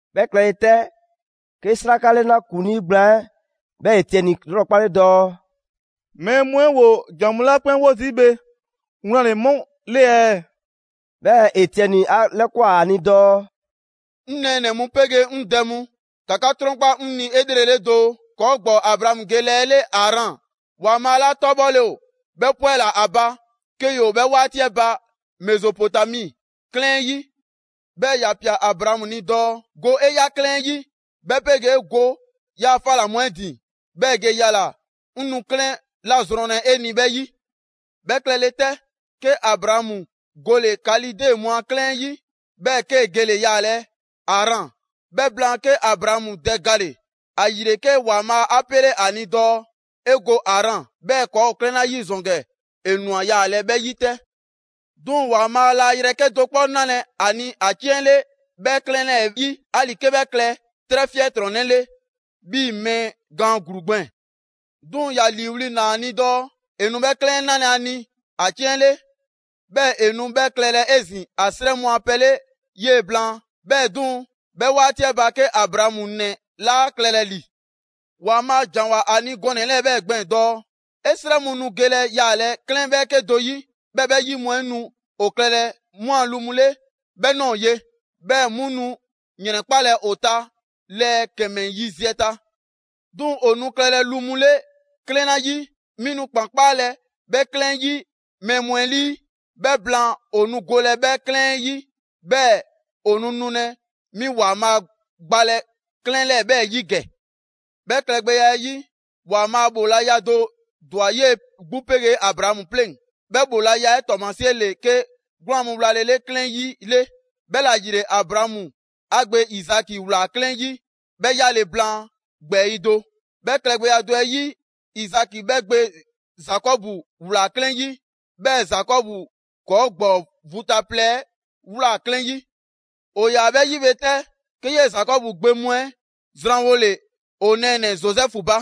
'Bhɛ klɛle 'tɛ, 'ke 'sraka 'lɛna ‑kuŋlii gblaan 'ɛ 'bhɛ Etiɛni 'lrɔkpale dɔɔ: «Mɛɛ mu 'ɛ ‑woo ‑jan mu 'la 'kpɛn 'wo zii' bhe, wlan ‑le 'mu ‑le ɛɛ?» 'Bhɛɛ‑ Etiɛni 'a 'lɛkwan꞊ ‑a ni dɔɔ: «'Ŋ nɛɛnɛ‑ mu 'pegee 'ŋ dɛ mu, ‑ka 'ka 'trɔnkpa 'ŋ ni 'elrele doo. ‑Kɔɔ' ‑gbɔɔ Abraamu ge ‑lɛɛ 'ɛ 'le Aran, ‑Waanbhaa' 'la 'tɔbhɔle ‑o 'bhɛ 'pwɛla‑ ‑a ba, 'ke ‑yoo 'bhɛ 'waati 'ɛ ba Mezopotami 'klɛɛn 'ɛ 'yi. 'Bhɛɛ‑ ‑ya ꞊pia Abraamu ni dɔɔ: ‹Go 'e ꞊ya 'klɛɛn 'yi 'bhɛ 'pegee go 'yaa‑ 'fa ꞊la mu 'ɛ ‑din, 'bhɛɛ‑ ge yala‑ 'ŋ nu 'klɛɛn 'la zrɔnlɛ 'e ni 'bhɛ 'yi.› 'Bhɛ klɛle 'tɛ, 'ke Abraamu gole‑ Kalide mu a 'klɛɛn 'ɛ 'yi, 'bhɛɛ‑ 'kee‑ gele‑ yaalɛ Aran. 'Bhɛ blaan, 'ke Abraamu dɛ gale‑. ‑Ayile 'ke ‑Waanbhaa' 'a 'pele ‑a ni dɔɔ ‑e go Aran. 'Bhɛɛ‑ ‑kɔɔ' ‑o 'klɛɛn 'la 'yi ‑zɔn ‑gɛ, ‑e ꞊nwa yaalɛ 'bhɛ 'yi 'tɛ. 'Duŋ‑ ‑Waanbhaa' laa yrɛ 'kedo‑ 'kpɔ 'nalɛ‑ ‑a ni ‑a 'ciɛn 'le 'bhɛ 'klɛɛn 'lɛɛ‑ 'yi, 'ali‑ 'ke 'bhɛ klɛ 'trɛ 'fiɛntrɔnnɛ 'le 'bhii‑ mɛɛ gaan ‑gluu gbɛɛn‑. 'Duŋ‑ ‑ya ‑liiwli' ꞊naa ‑a ni dɔɔ ‑e nu 'bhɛ 'klɛɛn 'ɛ 'nalɛ‑ ‑a ni ‑a 'ciɛn 'le, 'bhɛɛ‑ ‑e nu 'bhɛ klɛlɛ 'ezin‑ ‑a 'srɛ mu a pɛ 'le 'yee‑ blaan. 'Bhɛɛ‑ 'duŋ‑, 'bhɛ 'waati 'ɛ ba 'ke Abraamu 'nɛ 'laa klɛlɛ ‑li. ‑Waanbhaa' ‑janwoa ‑a ni gɔnɛ‑ 'lɛɛ‑ 'bhɛɛ‑ gbɛɛn‑ dɔɔ: ‹'E 'srɛ mu nu gelɛ yaalɛ 'klɛɛn 'bhɛɛke do 'yi, 'bhɛɛ‑ 'bhɛ 'yi mu 'ɛ nu ‑o klɛlɛ 'mu a lu mu 'le 'bhɛ ꞊nɔɔ ye; 'bhɛɛ‑ 'mu nu ‑yrɛnkpalɛ ‑o ta lɛɛ ‑kɛmɛ yiziɛ ta. 'Duŋ‑ ‑o nu klɛlɛ lu mu 'le 'klɛɛn 'la 'yi, 'mi nu ‑kpan 'kpaalɛ‑ 'bhɛ 'klɛɛn 'ɛ 'yi mɛɛ mu 'ɛ 'lii. 'Bhɛ blaan, ‑o nu golɛ 'bhɛ 'klɛɛn 'ɛ 'yi, 'bhɛɛ‑ ‑o nu nulɛ 'mi ‑Waanbhaa' gbalɛ 'klɛɛn 'lɛɛ‑ 'bhɛ 'yi ‑gɛ.› 'Bhɛ klɛgbɛya 'ɛ 'yi, ‑Waanbhaa' ‑bhoolaya do ‑dwa 'yee‑ 'gbu 'pegee Abraamu 'pleŋ. 'Bhɛ ‑bhoolaya 'ɛ 'tɔɔmasie ‑le 'ke 'gwlaan‑ mu wlalele 'klɛɛn 'yi 'le. 'Bhɛla‑ ‑yile Abraamu 'a gbe Izaki ꞊wlaa 'klɛɛn 'yi 'bhɛ 'yale‑ blaan ‑gbɛɛyi' do; 'bhɛ klɛgbɛya do 'ɛ 'yi, Izaki 'bhɛ gbe Zakɔbu ꞊wlaa 'klɛɛn 'yi, 'bhɛɛ‑ Zakɔbu ‑kɔɔ' ‑gbɔɔ vu ta plɛ 'ɛ ꞊wlaa 'klɛɛn 'yi.» «‑O ‑yaa 'bhɛ 'yi bhe 'tɛ, 'ke 'yee‑ Zakɔbu gbe mu 'ɛ zranwole ‑o nɛɛnɛ‑ Zozɛfu ba,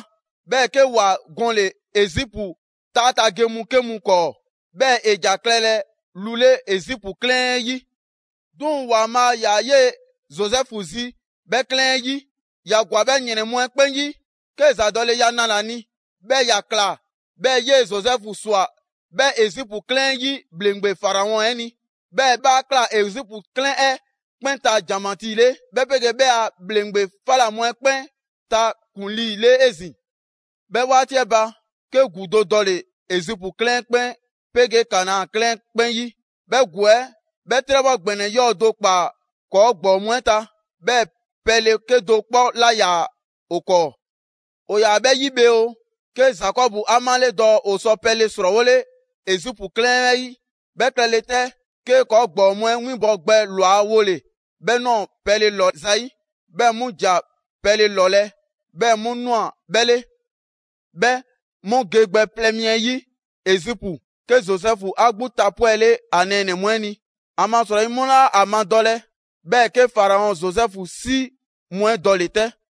'bhɛɛ‑ 'ke ‑wa gɔnle‑ Ezipu 'taa ta ge mu 'ke mu 'kɔɔ. 'Bhɛɛ‑ ‑e ‑ja klɛlɛ lu 'le Ezipu 'klɛɛn 'ɛ 'yi. 'Duŋ‑ ‑Waanbhaa' ‑yaa 'yee‑ Zozɛfu zi 'bhɛ 'klɛɛn 'ɛ 'yi. ‑Ya ‑gwa 'bhɛ ‑yrɛn mu 'ɛ 'kpɛn 'yi, 'kee‑ ‑zadɔleya nale‑ ‑a ni, 'bhɛɛ‑ ‑ya ꞊kla 'bhɛɛ‑ 'yee‑ Zozɛfu ꞊swa 'bhɛ Ezipu 'klɛɛn 'ɛ 'yi ‑bhleŋgbe Faraɔn 'ɛ ni. 'Bhɛɛ‑ 'bhɛ 'a ꞊kla Ezipu 'klɛɛn 'ɛ 'kpɛn ta ‑janmatii 'le, 'bhɛ 'pegee 'bhɛ a ‑bhleŋgbe 'fa ꞊la mu 'ɛ 'kpɛn ta ‑kuŋlii 'le 'ezin‑. 'Bhɛ 'waati 'ɛ ba, 'ke ‑gu do dɔle‑ Ezipu 'klɛɛn 'ɛ 'kpɛn 'pegee Kanaa 'klɛɛn 'ɛ 'kpɛn 'yi. 'Bhɛ ‑gu 'ɛ 'bhɛ 'trɛbhɔ ‑gbɛnɛ 'yɔɔ‑ do ꞊kpaa ‑kɔɔ' ‑gbɔɔ mu 'ɛ ta, 'bhɛɛ‑ pɛle 'kedo‑ 'kpɔ 'laa ‑yaa ‑o 'kɔɔ‑. ‑O ‑yaa 'bhɛ 'yi bhe oo, 'ke Zakɔbu 'a 'male‑ dɔɔ ‑o sɔ pɛle ‑srɔɔwole Ezipu 'klɛɛn 'ɛ 'yi. 'Bhɛ klɛle 'tɛ, 'kee‑ ‑kɔɔ' ‑gbɔɔ mu 'ɛ 'winbɔwo gbɛ ‑lwa wole‑ 'bhɛ ꞊nɔɔ pɛle ‑lɔ zayi'. 'Bhɛ mu ‑ja pɛle ‑lɔlɛ', 'bhɛɛ‑ 'mu ꞊nwa 'bhɛ 'le. 'Bhɛ mu ge gbɛ plɛ mi 'ɛ yi Ezipu, 'ke Zozɛfu 'a 'gbu tapwɛle ‑a nɛɛnɛ‑ mu 'ɛ ni, ‑amasrɔyi 'mu 'laa ‑a madɔlɛ. 'Bhɛɛ‑ 'ke Faraɔn Zozɛfu 'si mu 'ɛ dɔle‑ 'tɛ.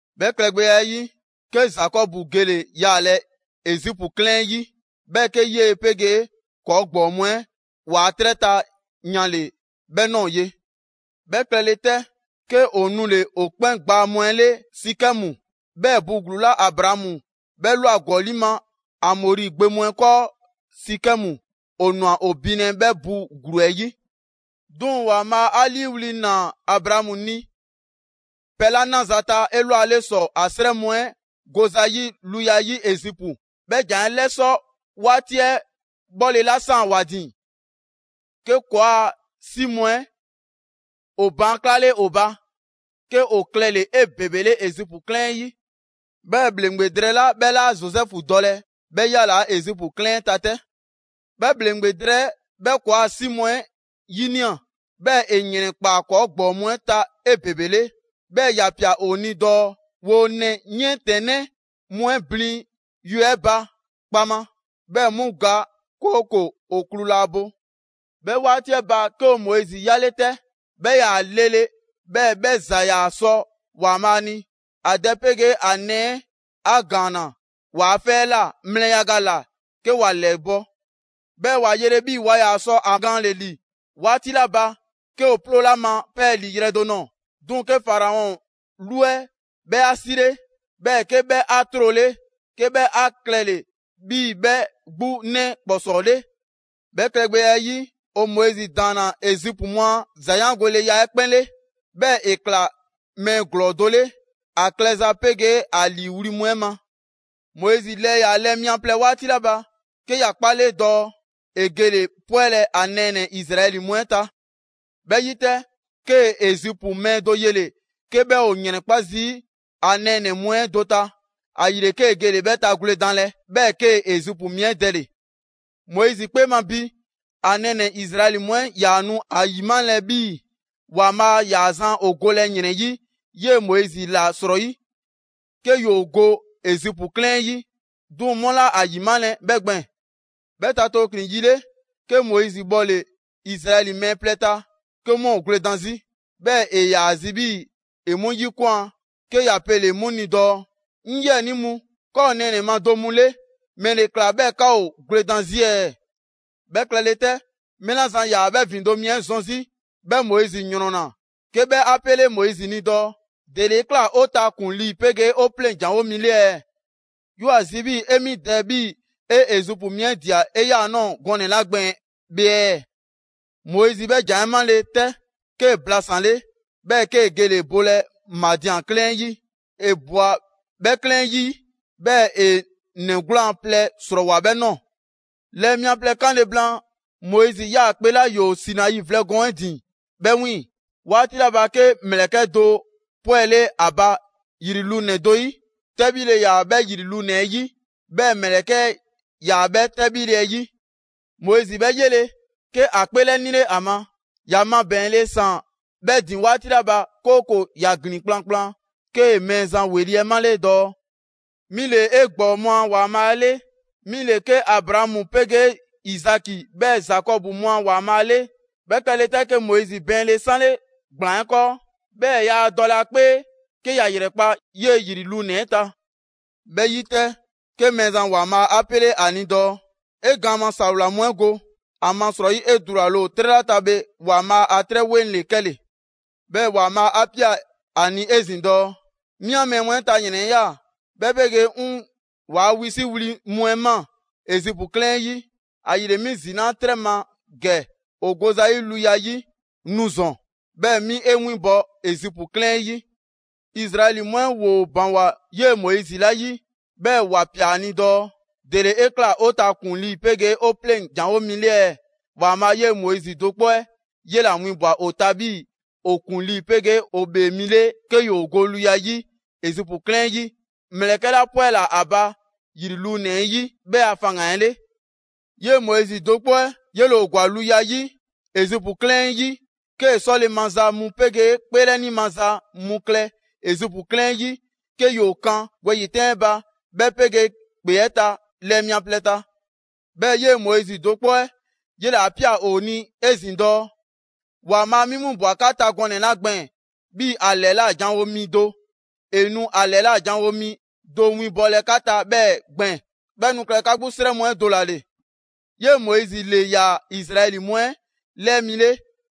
'Bhɛ klɛgbɛya 'ɛ 'yi, 'ke Zakɔbu gele‑ yaalɛ Ezipu 'klɛɛn 'ɛ 'yi, 'bhɛɛ‑ 'ke 'yee‑ 'pegee ‑kɔɔ' ‑gbɔɔ mu 'ɛ ‑waa' 'trɛ ta yanle‑ 'bhɛ ꞊nɔɔ ye. 'Bhɛ klɛle 'tɛ, 'ke ‑o nule‑ ‑o 'kpɛn gbaa mu 'ɛ 'le Sikɛmu, 'bhɛɛ‑ bu ‑gluu 'la Abraamu 'bhɛ ꞊lwa ‑gɔli' ma Amɔri gbe mu 'ɛ 'kɔɔ Sikɛmu, ‑o ꞊nwa ‑o binlɛ 'bhɛ bu ‑gluu 'ɛ 'yi.» «'Duŋ‑ ‑Waanbhaa' 'a 'liiwli‑ ꞊naa Abraamu ni pɛ 'la 'naza‑ ta 'elwale ‑sɔ ‑a 'srɛ mu 'ɛ go zayi' luya 'yi Ezipu, 'bhɛ ‑jan 'ɛ 'lɛsɔ 'waati 'ɛ 'bhɔlela ꞊saan ‑wa ‑din; 'ke ‑kɔɔa' 'si mu 'ɛ ‑o baan' 'klale ‑o ba 'ke ‑o klɛle‑ 'ebebele Ezipu 'klɛɛn 'ɛ 'yi. 'Bhɛɛ‑ ‑bhleŋgbe drɛɛ 'la 'bhɛ 'laa Zozɛfu dɔlɛ, 'bhɛ 'yalaa‑ Ezipu 'klɛɛn 'ɛ ta 'tɛ. 'Bhɛ ‑bhleŋgbe drɛɛ 'ɛ 'bhɛ ‑kɔɔa' 'si mu 'ɛ 'yinia‑, 'bhɛɛ‑ ‑e ‑yrɛnkpaa ‑kɔɔ' ‑gbɔɔ mu 'ɛ ta 'ebebele. 'Bhɛɛ‑ ‑ya ꞊pia ‑o ni dɔɔ ‑woo ‑nɛ 'yiɛntɛnnɛ mu 'ɛ blin yue 'ɛ ba kpaŋma 'bhɛɛ‑ 'mu ga, 'kooko‑ ‑o klu laa bo. 'Bhɛ 'waati 'ɛ ba, 'ke ‑o Moizi 'yale 'tɛ: 'bhɛ 'yaa‑ lele, 'bhɛɛ‑ 'bhɛ ‑za ‑yaa sɔ ‑Waanbhaa' ni. ‑A dɛ 'pegee ‑a nɛɛ 'a ‑gaanna ‑waa' 'fɛ 'ɛ ꞊la mlɛ yaga ‑la 'ke ‑wa ‑lɛbɔ'. 'Bhɛɛ‑ ‑wa yele 'bhii‑ waa ‑yaa sɔ ‑a gaanle‑ ‑li 'waati 'la ba, 'ke ‑o 'ploole ‑a ma 'pɛɛlii‑ yrɛ do nɔɔ‑. 'Duŋ‑ 'ke Faraɔn 'lu 'ɛ 'bhɛ 'a 'sile, 'bhɛɛ‑ 'ke 'bhɛ 'a 'trole, 'ke 'bhɛ 'a klɛle‑ 'bhii‑ 'bhɛ 'gbu 'nɛ ‑kpɔsɔɔ 'le. 'Bhɛ klɛgbɛya 'ɛ 'yi, ‑o Moizi ‑daanna Ezipu mu a ‑zayaangoleya 'ɛ 'kpɛn 'le. 'Bhɛɛ‑ ‑e ꞊kla mɛɛ ‑glɔɔ do 'le, ‑a klɛza 'pegee ‑a ‑liiwli' mu 'ɛ ma. Moizi lɛɛ ‑yaa lɛɛ mia plɛ 'waati 'la ba, 'ke ‑ya 'kpale dɔɔ ‑e gele‑ 'pwɛlɛ‑ ‑a nɛɛnɛ‑ Izraɛli mu 'ɛ ta. 'Bhɛ 'yi 'tɛ, 'kee‑ Ezipu mɛɛ do yele‑ 'ke 'bhɛ ‑o ‑yrɛnkpa' zii' ‑a nɛɛnɛ‑ mu 'ɛ do ta; ‑ayile 'kee‑ gele‑ 'bhɛ tagwledanlɛ 'bhɛɛ‑ 'kee‑ Ezipu mi 'ɛ dɛle‑. Moizi 'kpee ma ‑bi ‑a nɛɛnɛ‑ Izraɛli mu 'ɛ 'yaa‑ nu ‑a ‑yimalɛ 'bhii‑ ‑Waanbhaa' ‑yaa zan ‑o golɛ ‑yrɛn 'yi 'yee‑ Moizi ‑la 'srɔyi, 'ke ‑yoo go Ezipu 'klɛɛn 'ɛ yi. 'Duŋ‑ 'mu laa ‑a 'yimalɛ 'bhɛ gbɛɛn‑. 'Bhɛ ta tooklin‑ yi 'le, 'ke Moizi 'bhɔle Izraɛli mɛɛ plɛ ta 'ke 'mu ‑o gwledan 'zi, 'bhɛɛ‑ ‑e ‑yaa zi 'bhii‑ ‑e 'mu 'yikwan꞊ 'ke ‑ya pele‑ 'mu ni dɔɔ: ‹'Ŋ 'yiɛnii mu, 'ka ‑o nɛɛnɛ‑ ma do mu 'le, ‑mɛle ꞊kla 'bhɛɛ‑ 'ka ‑o gwledan 'zi ɛɛ?› 'Bhɛ klɛle 'tɛ, mɛɛ 'la zan ‑yaa 'bhɛ ‑vindo' mi 'ɛ zɔn 'zi, 'bhɛ Moizi ‑yrɔnna, 'ke 'bhɛ 'a pele‑ Moizi ni dɔɔ: ‹‑Dele 'e ꞊kla 'o ta ‑kuŋlii 'pegee 'o 'pleŋ‑ janwo mi 'le ɛɛ? 'Yoo‑ ‑a zi 'bhii‑ 'e 'mi dɛ 'bhii‑ 'e Ezipu mi 'ɛ ꞊dia 'eyaanɔɔ gɔnɛ‑ 'la gbɛɛn‑ bhe ɛɛ?› Moizi 'bhɛ ‑jan 'ɛ 'male‑ 'tɛ, 'kee‑ blasanle, 'bhɛɛ‑ 'kee‑ gele‑ bolɛ Madian a 'klɛɛn 'ɛ 'yi. ‑E ꞊bwa 'bhɛ 'klɛɛn 'ɛ 'yi, 'bhɛɛ‑ ‑e ‑nɛ 'gwlaan‑ plɛ ‑srɔɔwoa 'bhɛ ꞊nɔɔ.» «Lɛɛ mia plɛ 'kanle‑ blaan‑, Moizi ‑yaa ‑kpe 'la ‑yoo Sinai vlɛ gɔɔn 'ɛ ‑din 'bhɛ 'wiiŋ‑ 'waati 'la ba, 'ke ‑mlɛkɛ' do 'pwɛle ‑a ba ‑yri lunɛ‑ do 'yi: 'tɛbhile 'yaa‑ 'bhɛ ‑yri lunɛ‑ 'ɛ 'yi, 'bhɛɛ‑ ‑mlɛkɛ' 'ɛ 'yaa‑ 'bhɛ 'tɛbhile 'ɛ 'yi. Moizi 'bhɛ 'yele‑, 'ke ‑a 'kpeelɛnile ‑a ma. ‑Ya mabɛɛnle ‑saan 'bhɛ ‑din 'waati 'la ba, 'kooko‑ ‑ya ‑glin kplankplan, 'kee‑ Mɛɛzan ‑weli' 'ɛ male‑ dɔɔ: ‹'Mi ‑le 'e ‑gbɔɔ mu a ‑Waanbhaa' 'le, 'mi ‑le 'ke Abraamu 'pegee Izaki 'bhɛɛ‑ Zakɔbu mu a ‑Waanbhaa' 'le.› 'Bhɛ klɛle 'tɛ, 'ke Moizi bɛɛnle 'sanle ‑gblaan 'ɛ 'kɔɔ; 'bhɛɛ‑ yaa dɔlɛ ‑a 'kpee 'ke ‑ya ‑yrɛkpa' 'yee‑ ‑yri lunɛ‑ 'ɛ ta. 'Bhɛ 'yi 'tɛ, 'ke Mɛɛzan ‑Waanbhaa' 'a 'pele 'a ni dɔɔ: ‹'E gaan ma ‑sawla mu 'ɛ go, ‑amasrɔyi 'e dulale ‑o 'trɛ 'la ta bhe, ‑Waanbhaa' 'a 'trɛ 'weŋ ‑le 'kɛle‑.› 'Bhɛɛ‑ ‑Waanbhaa' 'a ꞊pia ‑a ni 'ezin‑ dɔɔ: ‹'Mi 'an mɛɛ mu 'ɛ ta ‑yrɛn 'ɛ ꞊ya, 'bhɛ 'pegee 'ŋ ‑waa' wisiwli mu 'ɛ ꞊maa Ezipu 'klɛɛn 'ɛ 'yi. ‑Ayile 'mi ‑zinaa' 'trɛ ma ‑gɛ ‑o go zayi' luya 'yi. Nu ‑zɔn, 'bhɛɛ‑ 'mi 'e 'winbɔ‑ Ezipu 'klɛɛn 'ɛ 'yi.›» «Izraɛli mu 'ɛ ‑woo ‑baŋgwa 'yee‑ Moizi 'la 'yi, 'bhɛɛ‑ ‑wa ꞊pia ‑a ni dɔɔ: ‹‑Dele 'e ꞊kla 'o ta ‑kuŋlii 'pegee 'o 'pleŋ‑ ‑janwo' mi 'le ɛɛ,› ‑Waanbhaa' 'yee‑ Moizi do 'kpɔ 'ɛ 'yela‑ winbwa‑ ‑o ta 'bhii‑ ‑o ‑kuŋlii 'pegee ‑o ‑bhee mi 'le 'ke ‑yoo go luya 'yi Ezipu 'klɛɛn 'ɛ 'yi, ‑mlɛkɛ' 'la 'pwɛla‑ ‑a ba ‑yri lunɛ‑ 'ɛ yi, 'bhɛ a faŋgan‑ 'ɛ 'le. 'Yee‑ Moizi do 'kpɔ 'ɛ 'yele‑ ‑o ‑gwa luya 'yi Ezipu 'klɛɛn 'ɛ 'yi, 'kee‑ 'sɔle‑ maza mu 'pegee 'kpeelɛni maza mu klɛ Ezipu 'klɛɛn 'ɛ 'yi, 'ke ‑yoo kan wɛyi‑ 'tɛn 'ɛ ba, 'bhɛ 'pegee ‑kpe 'ɛ ta lɛɛ mia plɛ ta. 'Bhɛɛ‑ 'yee‑ Moizi do 'kpɔ 'ɛ 'yele‑ 'a ꞊pia ‑o ni 'ezin‑ dɔɔ: ‹‑Waanbhaa' 'mi winbwa‑ 'ka 'ta gɔnɛ‑ 'la gbɛɛn‑ 'bhii‑ ‑a ‑lɛla' janwo mi do, ‑e nu ‑a ‑lɛla' ‑janwo' mi do winbɔlɛ 'ka ta 'bhɛɛ‑ gbɛɛn‑; 'bhɛ nu klɛlɛ 'ka 'gbu 'srɛ mu 'ɛ do ‑la ‑le.› 'Yee‑ Moizi ‑le ‑yaa Izraɛli mu 'ɛ lɛɛ mi 'le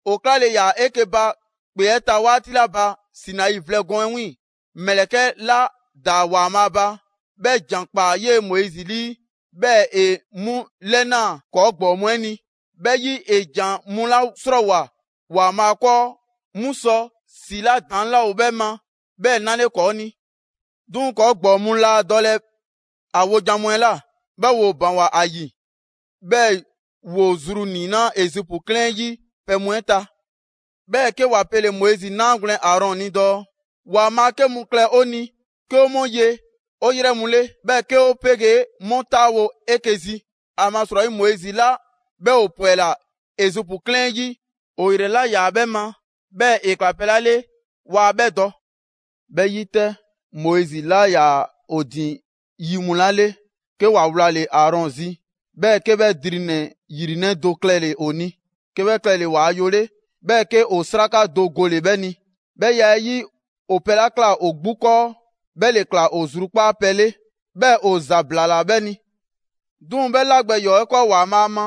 ‑o 'klale‑ ‑yaa 'eke‑ ba ‑kpe 'ɛ ta 'waati 'la ba Sinai vlɛ gɔɔn 'ɛ 'wiiŋ‑. ‑Mlɛkɛ' 'la ‑daa ‑Waanbhaa' ba, 'bhɛ ‑jan ꞊kpaa 'yee‑ Moizi 'lii, 'bhɛɛ‑ ‑e 'mu 'lɛnaa꞊ ‑kɔɔ' ‑gbɔɔ mu 'ɛ ni. 'Bhɛ 'yi, ‑e ‑jan mu 'la 'srɔɔwoa꞊ ‑Waanbhaa' 'kɔɔ, 'mu sɔ ‑si 'la ‑daŋ' 'laa ‑o 'bhɛ ma 'bhɛ 'nale ‑kɔɔ' ni.» «'Duŋ‑ ‑kɔɔ' ‑gbɔɔ mu laa dɔlɛ ‑a wojan mu 'ɛ ꞊la, 'bhɛɛ‑ ‑woo ‑baŋgwa ‑a ‑yi, 'bhɛɛ‑ ‑woo zru ‑niinaa' Ezipu 'klɛɛn 'ɛ 'yi pɛ mu 'ɛ ta. 'Bhɛɛ‑ 'ke ‑wa pele‑ Moizi 'naagwlɛn‑ Aarɔn ni dɔɔ: ‹‑Waanbhaa' 'ke mu klɛ 'o ni 'ke 'o 'mu 'ye 'o 'yrɛ mu 'le, 'bhɛɛ‑ 'ke 'o 'pegee 'mu 'taawo‑ 'eke‑ zi; ‑amasrɔyi Moizi 'la 'bhɛ 'o 'pwɛla‑ Ezipu 'klɛɛn 'ɛ 'yi, 'o 'yrɛ 'laa 'bhɛ ma, 'bhɛɛ‑ ‑e ꞊kla pɛ 'la 'le 'waa 'bhɛ dɔ.› 'Bhɛ 'yi 'tɛ, Moizi 'laa ‑yaa ‑o ‑din yi mu 'la 'le, 'ke ‑wa wlale‑ Aarɔn zi, 'bhɛɛ‑ 'ke 'bhɛ drinɛ‑ ‑yrinɛ' do klɛle‑ ‑o ni, 'ke 'bhɛ klɛle‑ ‑waa yo 'le, 'bhɛɛ‑ 'ke ‑o 'sraka do gole‑ 'bhɛ ni. 'Bhɛ ya 'ɛ 'yi, ‑o pɛ 'la ꞊kla ‑o 'gbu 'kɔɔ, 'bhɛ ‑le ꞊kla ‑o zrukpaa' pɛ 'le, 'bhɛɛ ‑o ‑zablaala 'bhɛ ni. 'Duŋ‑ 'bhɛ 'la gbɛ ‑yɔɔ' 'ɛ 'kɔɔ ‑Waanbhaa' ma,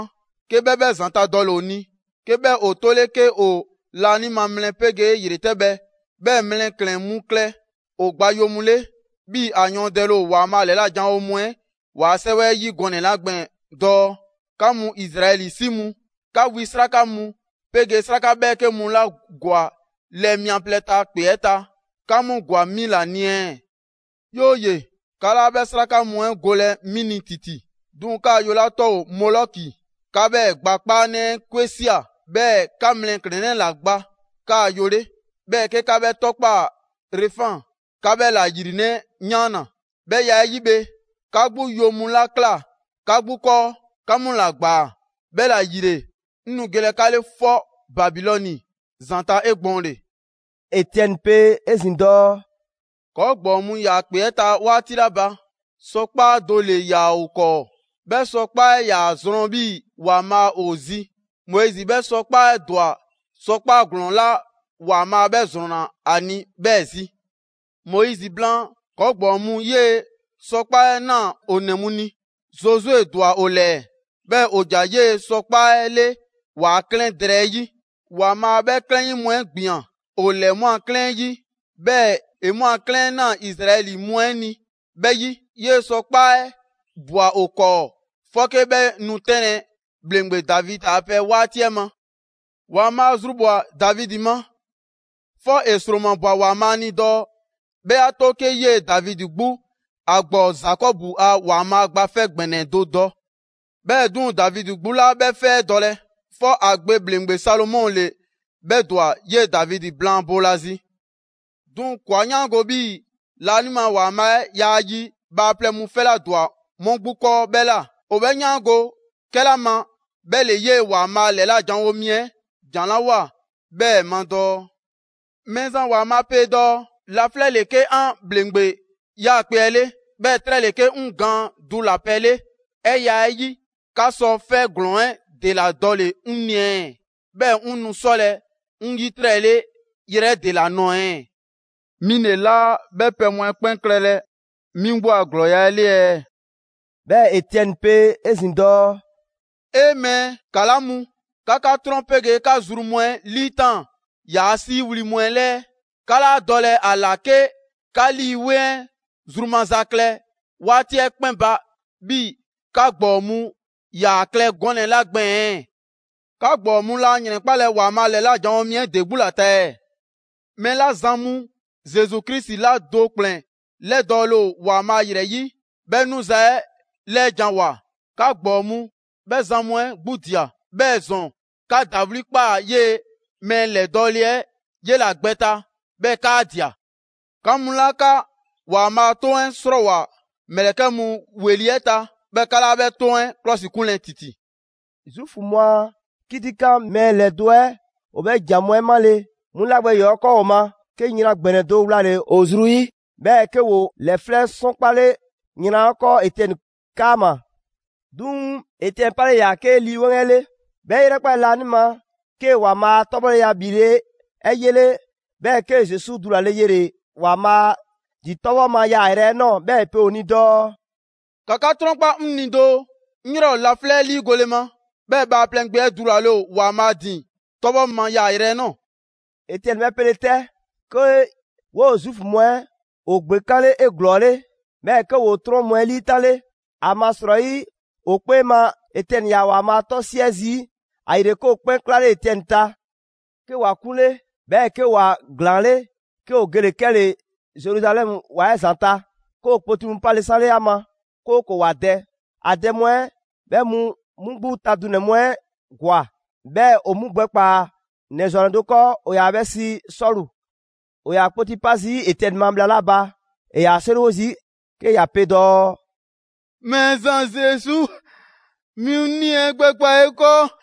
'ke 'bhɛ 'bhɛ ‑zanta' dɔle‑ ‑o ni, 'ke 'bhɛ ‑o 'tole 'ke ‑o laanima mlɛ 'pegee ‑yretɛbhɛ, 'bhɛɛ‑ mlɛklɛn‑ mu klɛ ‑o gba yo mu 'le, 'bhii‑ ‑a yɔɔndɛle ‑o ‑Waanbhaa' ‑lɛla' janwo mu 'ɛ ‑waa' 'sɛwɛ 'ɛ 'yi gɔnɛ‑ 'la gbɛɛn‑ dɔɔ: ‹'Ka mu Izraɛli 'si mu, 'ka wi 'sraka mu 'pegee 'sraka 'bhɛɛke mu 'la ‑gwa lɛɛ mia plɛ 'ɛ ta ‑kpe 'ɛ ta, 'ka 'mu ‑gwa 'mi ‑la ni ɛɛ? 'Yooye‑, 'ka 'laa 'bhɛ 'sraka mu 'ɛ golɛ 'mi ni ‑titi, 'duŋ‑ 'kaa‑ yo 'la 'tɔ ‑o Molɔki, 'ka 'bhɛɛ‑ gba 'kpaanɛ 'ɛ 'kwe ꞊sia; 'bhɛɛ‑ 'ka mlɛklɛnnɛ 'la gba 'kaa yo 'le, 'bhɛɛ‑ 'ke 'ka 'bhɛ 'tɔkpaa‑ Refan, 'ka 'bhɛ ‑la ‑yrinɛ' 'yaanna‑. 'Bhɛ ya 'ɛ 'yi bhe, 'ka 'gbu yo mu 'la ꞊kla 'ka 'gbu 'kɔɔ, 'ka 'mu ‑la ꞊gbaa. 'Bhɛla‑ ‑yile, 'ŋ nu gelɛ 'ka 'le 'fɔBabilɔni‑zanta' 'egbɔɔnle.›» Etiɛni pe 'ezin‑ dɔɔ: «‑Kɔɔ' ‑gbɔɔ mu ‑yaa ‑kpe 'ɛ ta 'waati 'la ba, sɔkpaa' do ‑le ‑yaa ‑o 'kɔɔ; 'bhɛ sɔkpaa' 'ɛ 'yaa‑ zrɔn 'bhii‑ ‑Waanbhaa' ‑o zi. Moizi 'bhɛ sɔkpaa' 'ɛ ‑dwa sɔkpaa' ‑glɔɔn 'la ‑Waanbhaa' 'bhɛ ‑zrɔnna ‑a ni, 'bhɛɛ‑ zi. Moizi blaan, ‑kɔɔ' ‑gbɔɔ mu 'yee‑ sɔkpaa' 'ɛ ꞊naa ‑o ‑nɛ mu ni. Zozue ‑dwa ‑o ‑lɛɛ, 'bhɛɛ‑ ‑o ‑ja 'yee‑ sɔkpaa' 'ɛ 'le ‑waa' 'klɛɛn drɛɛ 'ɛ 'yi. ‑Waanbhaa' 'bhɛ 'klɛɛn 'yi mu 'ɛ ‑gbian ‑o ‑lɛɛ 'mu a 'klɛɛn 'ɛ 'yi, 'bhɛɛ‑ ‑e 'mu a 'klɛɛn 'ɛ ꞊naa Izraɛli mu 'ɛ ni 'bhɛ 'yi. 'Yee‑ sɔkpaa' 'ɛ ꞊bwa ‑o 'kɔɔ 'fɔke 'bhɛ nu 'tɛnlɛ‑ ‑bhleŋgbe Davidi a pɛ 'waati 'ɛ ma. ‑Waanbhaa' zrubhwa‑ Davidi ma, 'fɔ ‑e ‑sromabwa ‑Waanbhaa' ni dɔɔ 'bhɛ 'a 'to 'ke 'yee‑ Davidi 'gbu ‑a ‑gbɔɔ Zakɔbu a ‑Waanbhaa Gba 'Fɛ ‑Gbɛnɛ do dɔ. 'Bhɛɛ‑ 'duŋ‑, Davidi 'gbu 'laa 'bhɛ 'fɛ 'ɛ dɔlɛ, 'fɔ ‑a gbe ‑bhleŋgbe Salomɔ ‑le 'bhɛ ‑dwa 'yee‑ Davidi blaan boolazi. 'Duŋ‑ ‑kɔɔa' 'yaango‑ 'bhii‑ laanima ‑Waanbhaa' 'ɛ yaa yi bhaaplɛŋ mu 'fɛ 'la ‑dwa 'mu 'gbu 'kɔɔ 'bhɛ ꞊la. 'O 'bhɛ 'yaango‑ 'kɛla ma, 'bhɛ ‑le 'yee‑ ‑Waanbhaa' ‑lɛla' janwo mi 'ɛ ‑jan 'la ꞊woa 'bhɛɛ‑ ma dɔɔ: Mɛɛzan ‑Waanbhaa' pe dɔɔ: ‹Laflɛ' ‑le 'ke 'an ‑bhleŋgbe 'yaakpe‑ 'ɛ 'le, 'bhɛɛ‑ 'trɛ ‑le 'ke 'ŋ gaan dulapɛ 'le. 'Bhɛ ya 'ɛ 'yi, 'ka sɔ 'fɛ ‑glɔɔn 'ɛ ‑dela dɔle‑ 'ŋ ni ɛɛ? 'Bhɛɛ‑ 'ŋ nu 'sɔlɛ‑ 'ŋ 'yitrɛle yrɛ 'ɛ ‑dela nɔɔ‑ ɛɛ? 'Mi ‑le 'laa 'bhɛ pɛ mu 'ɛ 'kpɛn klɛlɛ 'mi 'gbu a ‑glɔɔya' 'ɛ 'le ɛɛ?›» 'Bhɛɛ‑ Etiɛni pe 'ezin‑ dɔɔ: «'E! Mɛɛ ‑kala' mu! 'Ka 'ka 'trɔn 'pegee 'ka zru mu 'ɛ 'liitaan‑ ‑yaa' 'siiwli‑ mu 'ɛ 'lɛɛ. 'Ka 'laa dɔlɛ ‑a ‑la 'ke 'ka Lii 'Weŋ 'ɛ zru maza klɛ 'waati 'ɛ 'kpɛn ba 'bhii‑ 'ka ‑gbɔɔ mu ‑yaa klɛ gɔnɛ‑ 'la gbɛɛn‑. 'Ka ‑gbɔɔ mu laa ‑yrɛnkpalɛ ‑Waanbhaa' ‑lɛla' janwo mi 'ɛ ‑de 'gbu ‑la ta ɛɛ? Mɛɛ 'la zan mu Zesu Krisi 'la do ‑kplɛn ‑lɛdɔɔle ‑o ‑Waanbhaa' ‑yrɛ 'yi 'bhɛ 'nuza‑ 'ɛ ‑lɛɛjanwoa, 'ka ‑gbɔɔ mu 'bhɛ zan mu 'ɛ 'gbu ꞊dia. 'Bhɛɛ‑ ‑zɔn, 'ka ‑dawli' ꞊kpaa 'yee‑ mɛɛ ‑lɛdɔɔle 'ɛ 'yela‑ gbɛ ta, 'bhɛɛ‑ 'kaa ꞊dia. 'Ka mu 'la 'ka ‑Waanbhaa' a 'toŋ 'ɛ 'srɔɔwoa‑ ‑mlɛkɛ' mu ‑weli' 'ɛ ta, 'bhɛɛ‑ 'ka 'laa 'bhɛ 'toŋ 'ɛ ‑klɔsikunlɛ ‑titi!» Zuufu mu a 'kitikan mɛɛ ‑lɛdo' 'ɛ ‑o 'bhɛ ‑jan mu 'ɛ 'male‑, 'mu 'la gbɛ ‑yɔɔ' 'kɔɔ ‑o ma, 'ke yran ‑gbɛnɛ do wlale‑ ‑o zru 'yi, 'bhɛɛ‑ 'ke ‑ woo ‑lɛflɛ' 'sɔnkpale yran 'ɛ 'kɔɔ Etiɛni 'kaama‑. 'Duŋ‑ Etiɛni 'palela 'yaa‑ 'ke Lii 'Weŋ 'ɛ 'le, 'bhɛ 'e 'yrɛkpale laanima, 'kee‑ ‑Waanbhaa' a 'tɔbhɔleya ‑bhile' 'ɛ 'yele, 'bhɛɛ‑ 'kee‑ Zesu dulale yele‑ ‑Waanbhaa' ‑din 'tɔbhɔ ma yaayrɛ 'ɛ ꞊nɔɔ. 'Bhɛɛ‑ ‑e pe ‑o ni dɔɔ: «‑Ka 'ka 'trɔnkpa 'ŋ ni doo, 'ŋ 'yrɛ ‑o laflɛ' 'ɛ 'liigole ma, 'bhɛɛ‑ Bhaaplɛŋ Gbe 'ɛ dulale ‑o ‑Waanbhaa' ‑din 'tɔbhɔ ma yaayrɛ 'ɛ ꞊nɔɔ.» Etiɛni 'bhɛ 'pele‑ 'tɛ, 'ke 'woo‑ Zuufu mu 'ɛ ‑o ‑gbekanle 'eglɔɔle, 'bhɛɛ‑ 'ke ‑woo 'trɔn mu 'ɛ 'liitanle (‑amasrɔyi ‑o 'kpee ma Etiɛni ‑yaa ‑Waanbhaa' 'tɔ 'siɛ zii'). ‑Ayile 'ke ‑o 'kpɛn 'klale Etiɛni ta. 'Ke ‑wa 'kunle, 'bhɛɛ‑ 'ke ‑wa ‑glaanle', 'ke ‑o gele‑ 'kɛle‑ Zeruzalɛmu ‑wa 'ɛ ‑zanta'; 'ke ‑o kpoti mu 'pale 'sanle ‑a ma, 'kooko‑ ‑wa dɛ. ‑A dɛ mu 'ɛ 'bhɛ mu 'mu 'gbu ta dunɛ‑ mu 'ɛ ‑gwa, 'bhɛɛ‑ ‑o 'mu gbɛkpaa‑ ‑nɛ ‑zwannɛ do 'kɔɔ: ‑o ‑yaa 'bhɛ sii Sɔlu. ‑O ‑yaa kpoti 'pa zii' Etiɛni ma bhla 'la ba, ‑e ‑yaa 'seriwo zii' 'ke ‑ya pe dɔɔ: «Mɛɛzan Zesu, 'mi 'ŋ 'nii‑ 'ɛ gbɛkpaa‑ 'e 'kɔɔ!»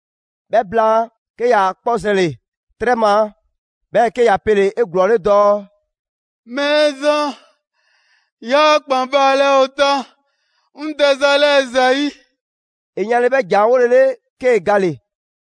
'Bhɛ blaan, 'ke ‑ya 'kpɔ zɛnle‑ 'trɛ ma; 'bhɛɛ‑ 'ke ‑ya pele‑ 'eglɔɔle dɔɔ: «Mɛɛzan, 'yaa ‑kpan baalɛ ‑o ta 'ŋ dɛza 'lɛɛ‑ ‑zayi'!» ‑E yanle 'bhɛ ‑jan 'ɛ 'wolele, 'kee‑ gale‑.